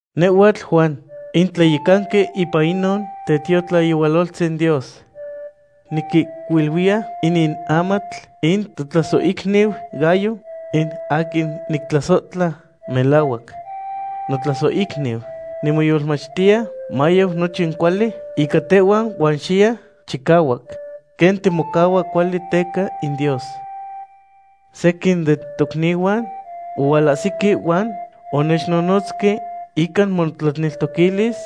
Nehhuatl Juan, in tlayecanqui ipan inon tetiotlayehualoltzin Dios. Niquihcuiluiya inin amatl in totlasohicniu Gayo, in aquin nictlasohtla melahuac. Notlasohicniu, nimoyolmachtiya mayau nochin cuali ica tehhua huan xiye chicahuac, quen timocahua cuali teca in Dios. Sequin den tocnihuan ohualahsihque huan onechnonotzque ica motlaneltoquilis,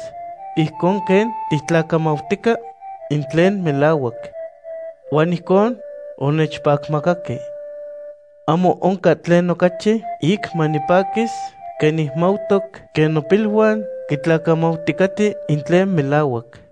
ijcon quen tictlacamautica in tlen melahuac. Huan ijcon onechpacmacahque. Ahmo oncan tlen ocachi ic manipaquis quen nicmautoc quen nopiluan quitlacamauticaten in tlen melahuac.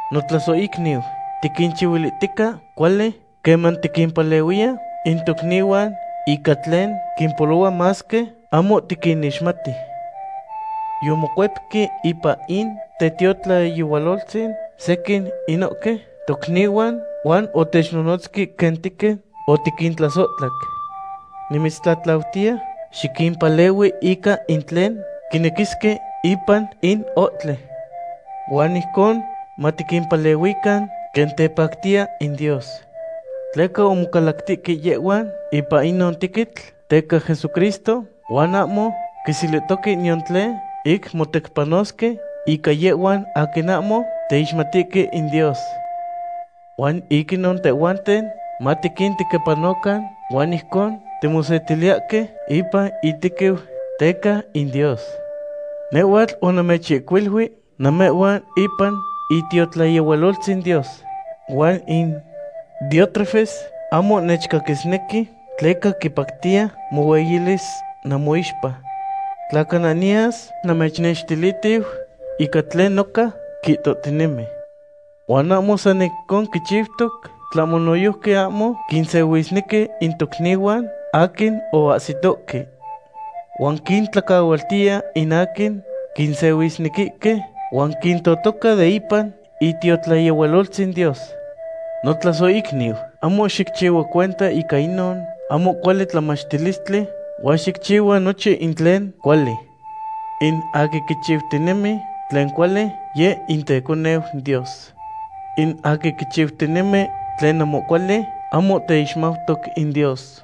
Notlasohicniu, tiquinchihuilihtica cuali queman tiquimpalehuiya in tocnihuan ica tlen quimpolohua masque ahmo tiquinixmati. Yomocuepque ipan in tetiotlayehualoltzin sequin inohque tocnihuan, huan otechnonotzque quen tequin otiquintlasohtlac. Nimitztlatlautiya xiquimpalehui ica in tlen quinequisque ipan in ohtli. Huan ijcon matiquimpalehuican quen tepactiya in Dios. Tleca omocalactihque yehhuan ipan inon tequitl teca Jesucristo huan ahmo quiselihtohque niyan tlen ic motecpanosque ica yehhuan aquin ahmo teixmatihque in Dios. Huan ic inon tehhuanten matiquintequipanocan huan ijcon timosetiliyahque ipan intequiu teca in Dios. Nehhuatl onamechihcuilui namehhuan ipan itiotlayehualoltzin Dios, huan in Diótrefes ahmo nechcaquisnequi, tleca quipactiya mohueyilis namoixpa. Tla cana niyas, namechnextilitiu ican tlen noca quihtohtinemi. Huan ahmo san ijcon quichiutoc, tlahmo noyojqui ahmo quinsehuisnequi in tocnihuan aquin oahsitohque. Huan quintlacahualtiya in aquin quinsehuisnequihque, huan quintotoca de ipan itiotlayehualoltzin Dios. Notlasohicniu, ahmo xicchihua cuenta ica inon ahmo cuali tlamachilistli, huan xicchihua nochin in tlen cuali. In aquin quichiutinemi tlen cuali, yeh in teconeu in Dios. In aquin quichiutinemi tlen ahmo cuali ahmo teixmautoc in Dios.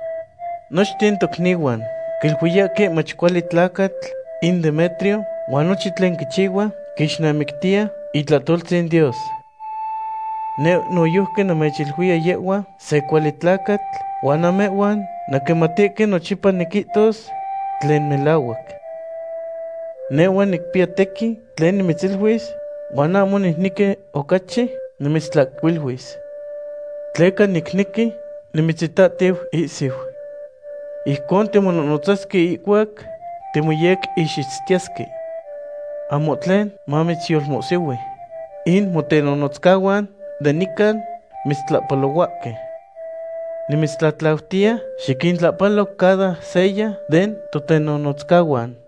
Nochten tocnihuan quiluiyahque mach cuali tlacatl in Demetrio, huan nochin tlen quichihua quixnamictiya itlahtoltzin Dios. Neh noyojqui namechiluiya yehhua se cuali tlacatl huan namehhuan nanquimatihque nochipa niquihtos tlen melahuac. Nehhua nicpiya tequin tlen nimitziluis, huan ahmo nicnequi ocachi nimitztlahcuiluis. Tleca nicnequi nimitzitatiu ihsiu. Ijcon timonohnotzasque ihcuac timoyequixitztiyesque. Ahmo tlen mamitzyolmohsihui. In motenonotzcahuan de nican mitztlahpalohuahque. Nimitztlatlautiya xiquintlahpalo cada seya den totenonotzcahuan.